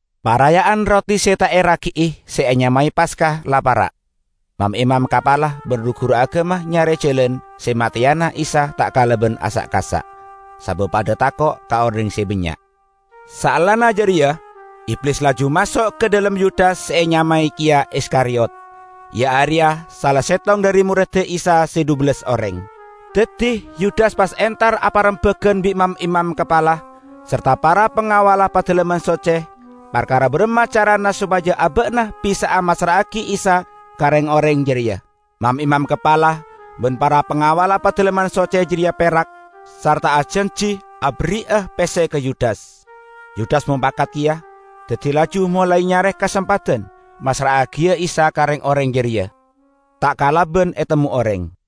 Paraya'an Roti Se Ta' Eragi'i se enyamae Paska la para'. Mam-imam kapala ban ru-guru agama nyare jalan se mateyana Isa ta' kalaban asa'-kasa', sabab padha tako' ka oreng se bannya'. Saellana jareya Iblis laju maso' ka dhalem Yudas se enyamae keya Iskariyot, iya areya sala settong dhari moredda Isa se dhubellas oreng. Daddi Yudas pas entar aparembagan bi' mam-imam kapala sarta para pangawalla Padalemman Socce parkara baramma carana sopaja aba'na bisa'a massra'agi Isa ka reng-oreng jareya. Mam-imam kapala ban para pangawalla Padalemman Socce jareya perak sarta ajanji aberri'a pesse ka Yudas. Yudas mopakat keya, daddi laju molae nyare kasempadan massra'agiya Isa ka reng-oreng jareya, ta' kalaban etemmo oreng.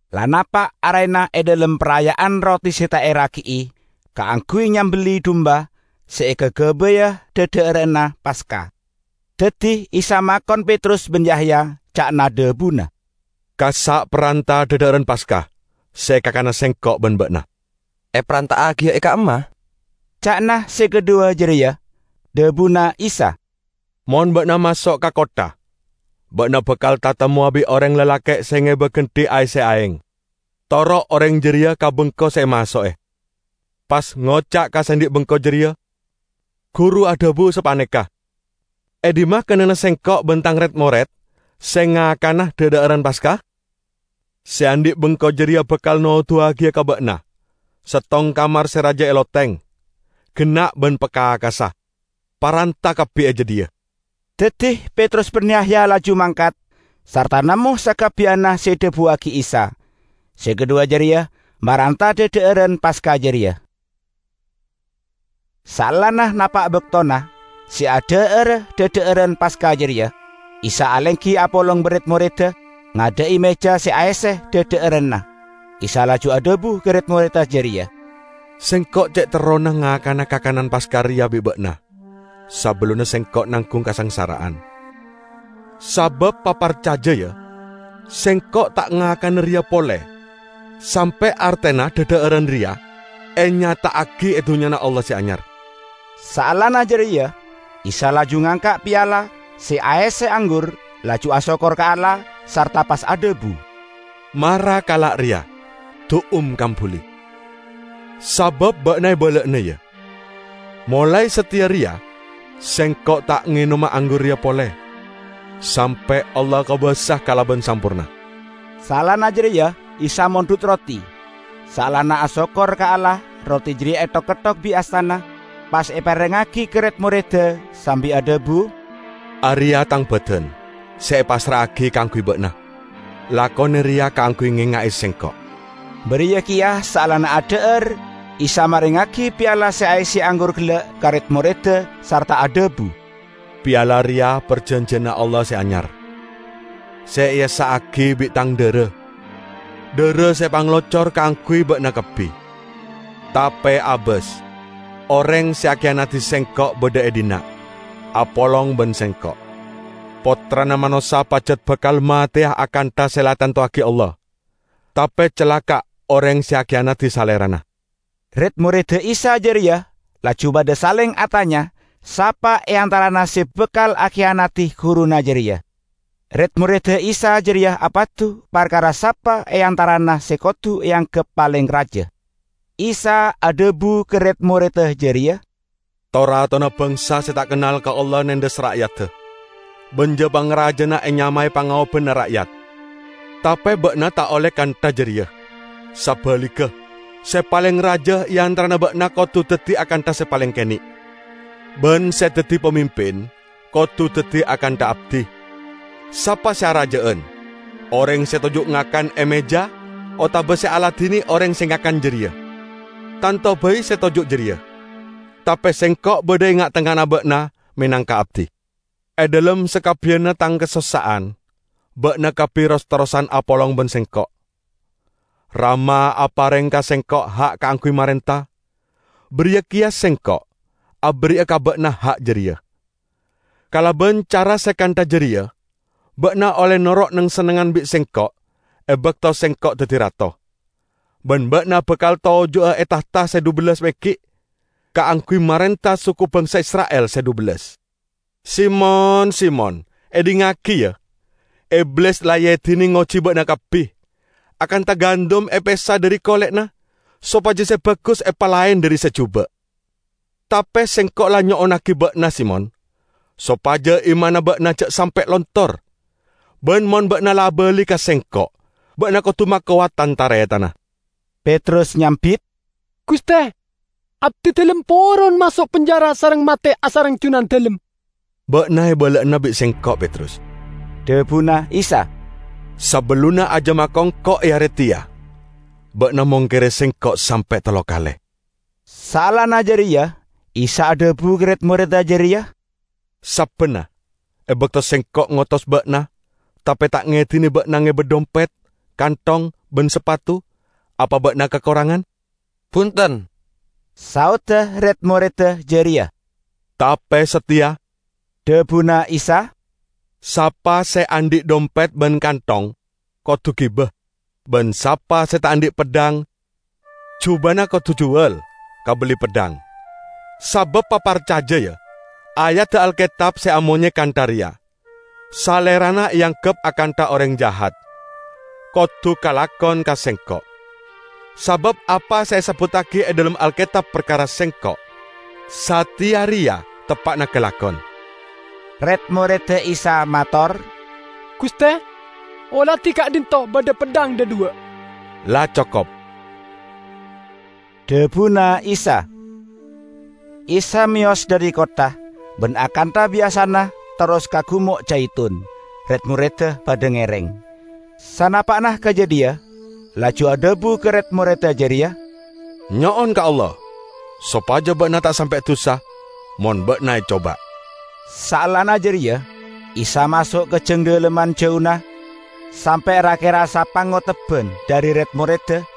La napa' arena e dhalem Paraya'an Roti Se Ta' Eragi'i kaangguy nyambelli dumba se ekagabaya dhadha'aran Paska. Daddi Isa makon Petrus ban Yahya, ca'na dhabuna, "Kassa' paranta dhadha'aran Paska se ekakana Sengko' ban ba'na." "Eparanta'agiya e ka'imma?" ca'na se kadhuwa jareya. Dhabuna Isa, "Mon ba'na maso' ka kottha, ba'na bakal tatemmowa bi' oreng lalake' se ngeba gendhi aesse aeng. Toro' oreng jareya ka bengko se emaso'e, pas ngoca' ka se andhi' bengko jareya: Guru adhabu sapaneka, 'E dhimma kennengnganna Sengko' ban Tang red-mored se ngakana dhadha'aran Paska?' Se andhi' bengko jareya bakal noduwagiya ka ba'na settong kamar se raja e loteng, genna' ban pakakassa. Paranta kabbi e jadhiya." Daddi Petrus ban Yahya laju mangkat, sarta nemmo sakabbiyanna se edhabuwagi Isa. Se kadhuwa jareya maranta dhadha'aran Paska jareya. Saellana napa' baktona se adha'ara dhadha'aran Paska jareya, Isa alenggi apolong ban red-moredda ngadha'i meja se aesse dhadha'aranna. Isa laju adhabu ka red-moredda jareya, "Sengko' ce' terrona ngakana kakanan Paska reya bi' ba'na sabellunna Sengko' nanggung kasangsara'an! Sabab, paparcaja, ya: Sengko' ta' ngakana reya pole sampe' artena dhadha'aran reya enyata'agi e Dunnyana Allah Se Anyar." Saellana jareya Isa laju ngangka' piala se aesse anggur, laju asokkor ka Allah, sarta pas adhabu, "Mara kala' reya, du'um kambuli. Sabab ba'na ebala'ana, ya, molae sateya reya Sengko' ta' ngenoma anggur reya pole sampe' Allah kobasa kalaban samporna." Saellana jareya Isa mondhut roti. Saellana asokkor ka Allah roti jareya ethok-ketthok bi' astana, pas eparengngagi ka red-moredda sambi adhabu, "Areya' Tang badan [se epassra'agi kaangguy ba'na. Lakone reya kaangguy ngenga'e Sengko'." Bariya keya saellana adha'ar Isa marengngagi piala se aesse anggur gella' ka red-moredda sarta adhabu, "Piala reya parjanjiyanna Allah se anyar, se eessa'agi bi' tang dhara -- dhara se epangalocor kaangguy ba'na kabbi]." "Tape abas! Oreng se akiyanadi Sengko' badha e dhinna', apolong ban Sengko'! Pottrana Manossa pajat bakal mateya akantha se la etantowagi Allah; tape calaka' oreng se akiyanadi Salerana!" Red-moredda Isa jareya laju padha saleng atanya sapa e antarana se bakal akiyanadi guruna jareya. Red-moredda Isa jareya apadu parkara sapa e antarana se kodu eanggep paleng raja. Isa adhabu ka red-moredda jareya, "To-ratona bangsa se ta' kennal ka Allah nendhes ra'yadda, ban ja-pangrajana enyamae 'Pangaobanna Ra'yat'. Tape ba'na ta' olle kantha jareya. Sabaligga, se paleng raja e antarana ba'na kodu daddi akantha se paleng kene', ban se daddi pamimpin kodu daddi akantha abdi. Sapa se araja'an: oreng se toju' ngakan e meja otaba se aladine oreng se ngakan jareya? Tanto bai se toju' jareya. Tape Sengko' badha e nga'-tengnga'anna ba'na menangka abdi. E dhalem sakabbiyanna Tang kasossa'an ba'na kabbi ros-terrosan apolong ban Sengko'. Rama apareng ka Sengko' ha' kaangguy marenta, bariya keya Sengko' aberri'a ka ba'na ha' jareya. Kalaban cara se kantha jareya ba'na olle noro' neng-sennengngan bi' Sengko' e bakto Sengko' daddi Rato. Ban ba'na bakal toju'a e tahta se dhubellas meggi' kaangguy marenta suku bangsa Isra'il se dhubellas." "Simon, Simon, edhingngagi, ya! Iblis la eedine ngoji ba'na kabbi, akantha gandum epesa dhari kole'na sopaja se bagus epalaen dhari se juba'. Tape Sengko' la nyo'onnagi ba'na, Simon, sopaja imanna ba'na ja' sampe' lontor. Ban mon ba'na la abali ka Sengko', ba'na kodu makowat tan-taretanna." Petrus nyambit, "Guste, abdidalem poron maso' penjara sareng mate asareng Junandalem!" "Ba'na ebala'ana bi' Sengko', Petrus," dhabuna Isa, "sabellunna ajam akongko' e are teya, ba'na mongkere Sengko' sampe' tello kale." Saellana jareya Isa adhabu ka red-moredda jareya, "Sabbanna, e bakto Sengko' ngotos ba'na tape ta' ngedine ba'na ngeba dhompet, kanthong ban sapatu, apa ba'na kakorangan?" "Bunten!" saodda red-moredda jareya. "Tape sateya," dhabuna Isa, "sapa se andhi' dhompet ban kanthong, kodu giba; ban sapa se ta' andhi' peddhang, jubana kodu juwal kabelli peddhang. Sabab paparcaja, ya, ayadda Alketab se amonye kantha reya, 'Salerana eanggep akantha oreng jahat,' kodu kalakon ka Sengko'. Sabab apa se esebbuttagi e dhalem Alketab parkara Sengko', sateya reya teppa'na kalakon." Red-moredda Isa mator, "Guste, oladi ka'dhinto' badha peddhang dhadhuwa'." "La cokop!" dhabuna Isa. Isa meyos dhari kottha, ban akantha biyasana terros ka Gumo' Jaitun, red-moredda padha ngereng. Sanapa'na ka jadhiya, laju adhabu ka red-moredda jareya, "Nyo'on ka Allah, sopaja ba'na ta' sampe' dusa mon ba'na ecoba." Saellana jareya Isa maso' ka jang dhalemman jauna sampe' ra-kera sapangotebban dhari red-moredda,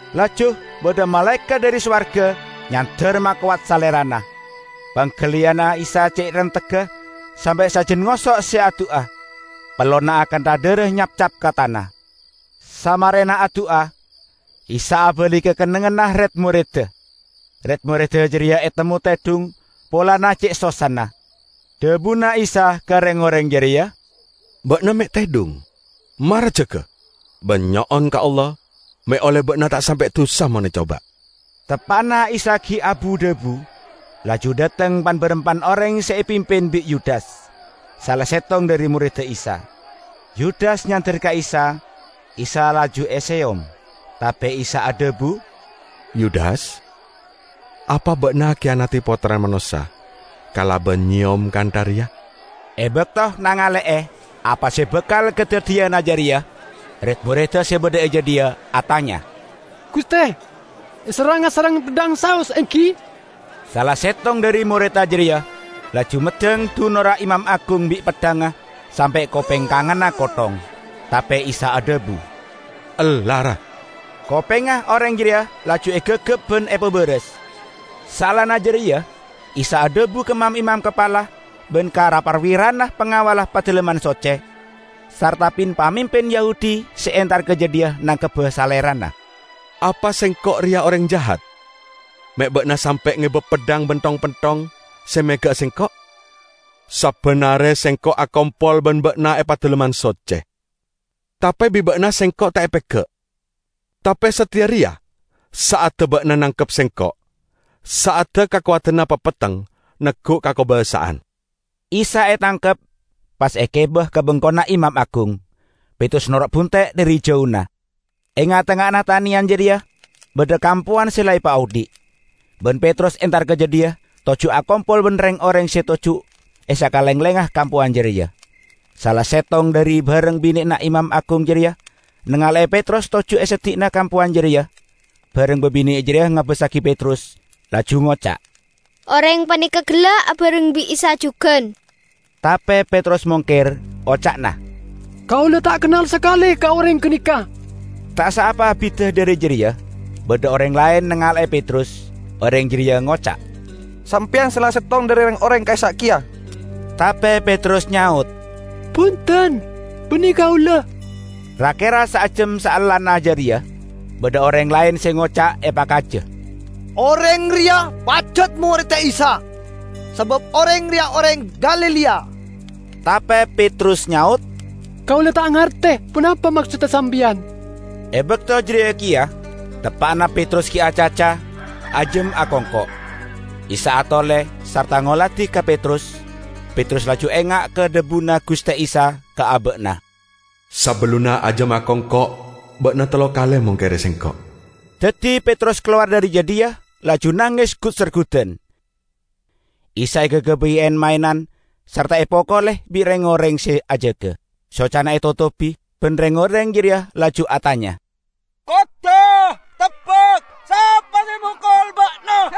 Laju badha malaekat dhari sowarga nyander makowat Salerana. Panggaliyanna Isa ce' rentegga sampe' sajan ngoso' se adu'a; pellona akantha dhara nyapcap ka tana.] Samarena adu'a, Isa abali ka kennengnganna red-moredda. Red-moredda jareya etemmo tedhung polana ce' sossana. Dhabuna Isa ka reng-oreng jareya, "Ba'na me' tedhung? Mara jaga ban nyo'on ka Allah me' olle ba'na ta' sampe' dusa mon ecoba." Teppa'na Isa gi' abu-dhabu, laju dhateng pan-barampan oreng se epimpin bi' Yudas, sala settong dhari moredda Isa. Yudas nyander ka Isa, Isa laju eseyom. Tape Isa adhabu, "Yudas, apa ba'na akiyanadi Pottrana Manossa kalaban nyeyom kantha reya?" E bakto nangale'e apa se bakal kadaddiyana jareya, red-moredda se badha e jadhiya atanya, "Guste, eserranga sareng peddhang saos, enggi?" Sala settong dhari moredda jareya laju meddhang dunorra imam agung bi' peddhangnga sampe' kopeng kanganna kotthong. Tape Isa adhabu, "Ella, ra!" Kopengnga oreng jareya laju egagap ban epabaras. Saellana jareya Isa adhabu ka mam-imam kapala ban ra-parwirana pangawalla Padalemman Socce, sarta pin-pamimpin Yahudi se entar ka jadhiya nangkebba Salerana, "Apa Sengko' reya oreng jahat, me' ba'na sampe' ngeba peddhang ban thong-penthong se mega'a Sengko'? Sabban are Sengko' akompol ban ba'na e Padalemman Socce, tape bi' ba'na Sengko' ta' epega'. Tape sateya reya sa'adda ba'na nangkep Sengko', sa'adda kakowadanna papetteng neggu' kakobasa'an." Isa etangkep pas egiba ka bengkona imam agung. Petrus noro' bunte' dhari jauna. E nga'-tengnga'anna taneyan jareya badha kampowan se la epaodhi', ban Petrus entar ka jadhiya toju' akompol ban reng-oreng se toju' e sakalenglengnga kampowan jareya. Sala settong dhari bareng bine'na imam agung jareya nangale'e Petrus toju' e seddi'na kampowan jareya; bareng babine' jareya ngabassagi Petrus, laju ngoca', "Oreng paneka gella' abareng bi' Isa jugan!" Tape Petrus mongker, oca'na, "Kaula ta' kennal sakale ka oreng ganeka!" Ta' saapa abidda dhari jareya badha oreng laen nangale'e Petrus. Oreng jareya ngoca', "Sampeyan sala settong dhari reng-oreng ka'issa' keya." Tape Petrus nyaot, "Bunten, banne kaula!" Ra-kera saejjam saellana jareya, badha oreng laen se ngoca' epakaja, "Oreng reya pajat moredda Isa, sabab oreng reya oreng Galilea!" Tape Petrus nyaot, "Kaula ta' ngarte ponapa maksodda sampeyan!" E bakto jareya keya, teppa'na Petrus gi' acaca, ajam akongko'. Isa atole sarta ngoladi ka Petrus. Petrus laju enga' ka dhabuna Guste Isa ka aba'na, "Sabellunna ajam akongko' ba'na tello kale mongkere Sengko'." Daddi Petrus kalowar dhari jadhiya, laju nanges gut-sergudan. Isa ekagabay en-maenan sarta epokole bi' reng-oreng se ajaga. Socana etotobi, ban reng-oreng jareya laju atanya, "Kodda' tebbak, sapa se mokol Ba'na?"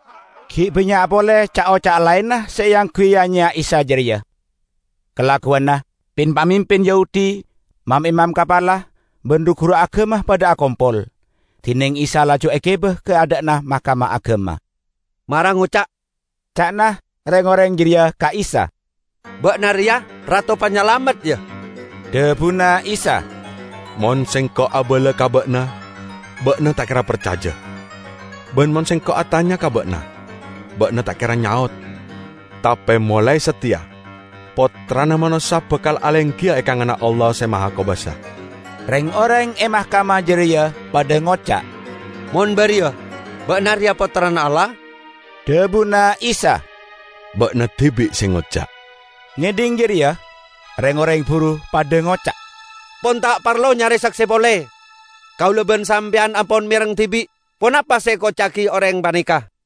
Gi' bannya' pole ca'-oca' laenna se eangguy ya-nyeya Isa jareya. Kalagguwanna, pin-pamimpin Yahudi, mam-imam kapala, ban ru-guru agama padha akompol, dineng Isa laju egiba ka adha'na Mahkamah Agama. "Mara ngoca'," ca'na reng-oreng jareya ka Isa, "ba'na reya Rato Panyalamet, ya?" Dhabuna Isa, "Mon Sengko' abala ka ba'na, ba'na ta' kera parcaja. Ban mon Sengko' atanya ka ba'na, ba'na ta' kera nyaot. Tape molae sateya, Pottrana Manossa bakal alenggiya e kanganna Allah Se Mahakobasa." Reng-oreng e Mahkamah jareya padha ngoca', "Mon bariya, ba'na reya Pottrana Allah?" Dhabuna Isa, "Ba'na dibi' se ngoca'." Ngedhing jareya, reng-oreng buru padha ngoca', "Pon ta' parlo nyare sakse pole! Kaula ban sampeyan ampon mereng dibi' ponapa se ekoca'agi oreng paneka!"